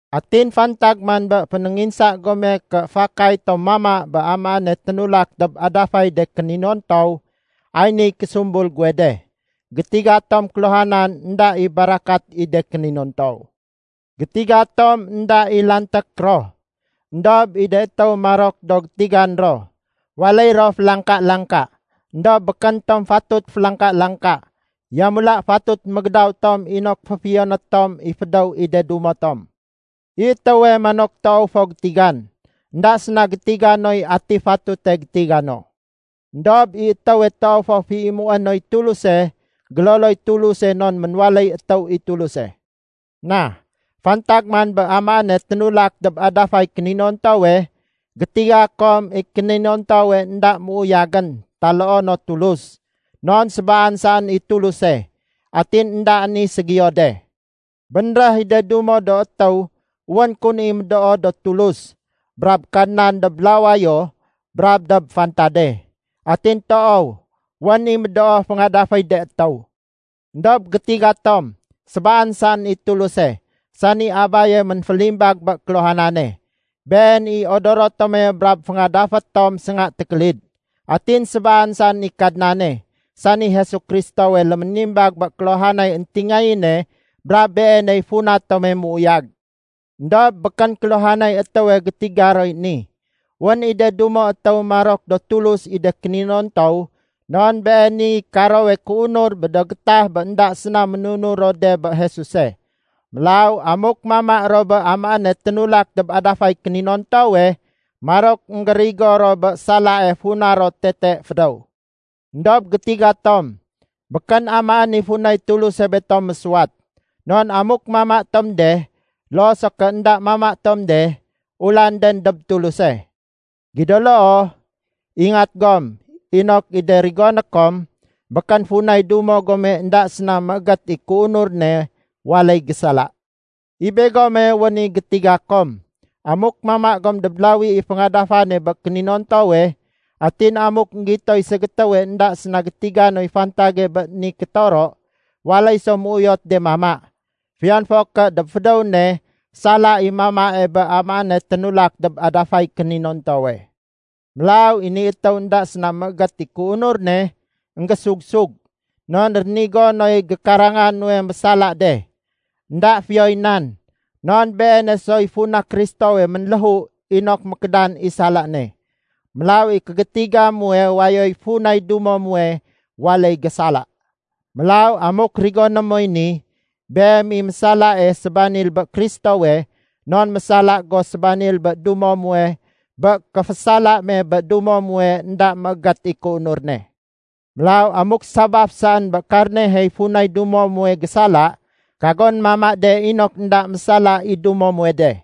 Atin fantag man bé fénénginsa gome ké fakay tom mama bé amaéne ténulak dob adafay de kéninontow, ay niy késumbul guwe de. Gétiga tom kéluhanan énda i barakat i de kéninontow. Gétiga tom énda i lanték ro. Endob i de étéw marok do gétigan ro, waléy ro félangka-langka. Endob békén tom fatut félangka-langka, yamula fatut mégédaw tom inok féfiyoné tom i fédéw i de dumo tom. I étéwe manok toow fo gétigan, énda séna gétiga noy ati fatute gétiga no. Endob i étéwe toow fo féimué noy Tuluse, géloloy Tuluse non ménwaléy étéw i Tuluse. Na, fantag man bé amaéne ténulak dob adafay kéninontowe, gétiga kom i kéninontowe énda méuyagén taloo no Tulus. Non sébaan saén i Tuluse, atin éndaén i ségiyo de. Bénréh i de dumo do étéw wén kun i médoo do tulus brab kadnan dob lawayo brab dob fantade. Atin toow, wén i médoo féngadaféy de étéw. Endob gétiga tom, sébaan saén i Tuluse, sani Abaye ménfélimbag bé kéluhanane. Been i odoro tome brab féngadafé tom sénga tékélid. Atin sébaan saén i Kadnane sani Jesu Kristowe léménimbag bé kéluhanay éntingayéne brab Beeney funa tome méuyag. Endob békén kéluhanay étéwe gétiga roy ni. Wén i de dumo étéw marok do tulus i de kéninontow non beeniy karowe kéunur bé do gétah bé énda séna ménunur ro de bé Jesuse. Mélaw amuk mama ro bé amaéne ténulak dob adafay kéninontowe, marok énggérigo ro bé salae funa ro tete fédéw. Endob gétiga tom, békén amaén i funay Tuluse betom mésuwat. Non amuk mama tom de, loo so ké énda mama tom de, ulanden dob Tuluse. Gido loo, ingat gom inok i de rigoné kom, békén funay dumo gome énda séna méégét i kéunur ne, waléy gésala. I begome wén i gétiga kom, amuk mama gom dob lawie féngadafan bé kéninontowe, atin amuk énggitoy ségétéwe énda séna gétiga noy fantage bé de ni kétoro, waléy so méuyot de mama, fiyon fo ké dob fédéw ne sala i mamae bé amaéne ténulak dob adafay kéninontowe. Mélaw i ni étéw énda séna méégét i kéunur ne, énggésug-sug, non rénigo noy gékaranga nuwe mésala de. Enda fiyoy nan, non beene soy funa Kristowe ménléhu inok mékédan i sala ne. Mélaw i kégétiga muwe wayoy funay dumo muwe waléy gésala. Mélaw amuk rigoné moy ni, beem i mésalae sébanil bé Kristowe non mésala go sébanil bé dumo muwe bé kéfésala me bé dumo muwe énda méégét i kéunur ne. Mélaw amuk sabaf saén bé karnehey funay dumo muwe gésala, kagon mama de inok énda mésala i dumo muwe de.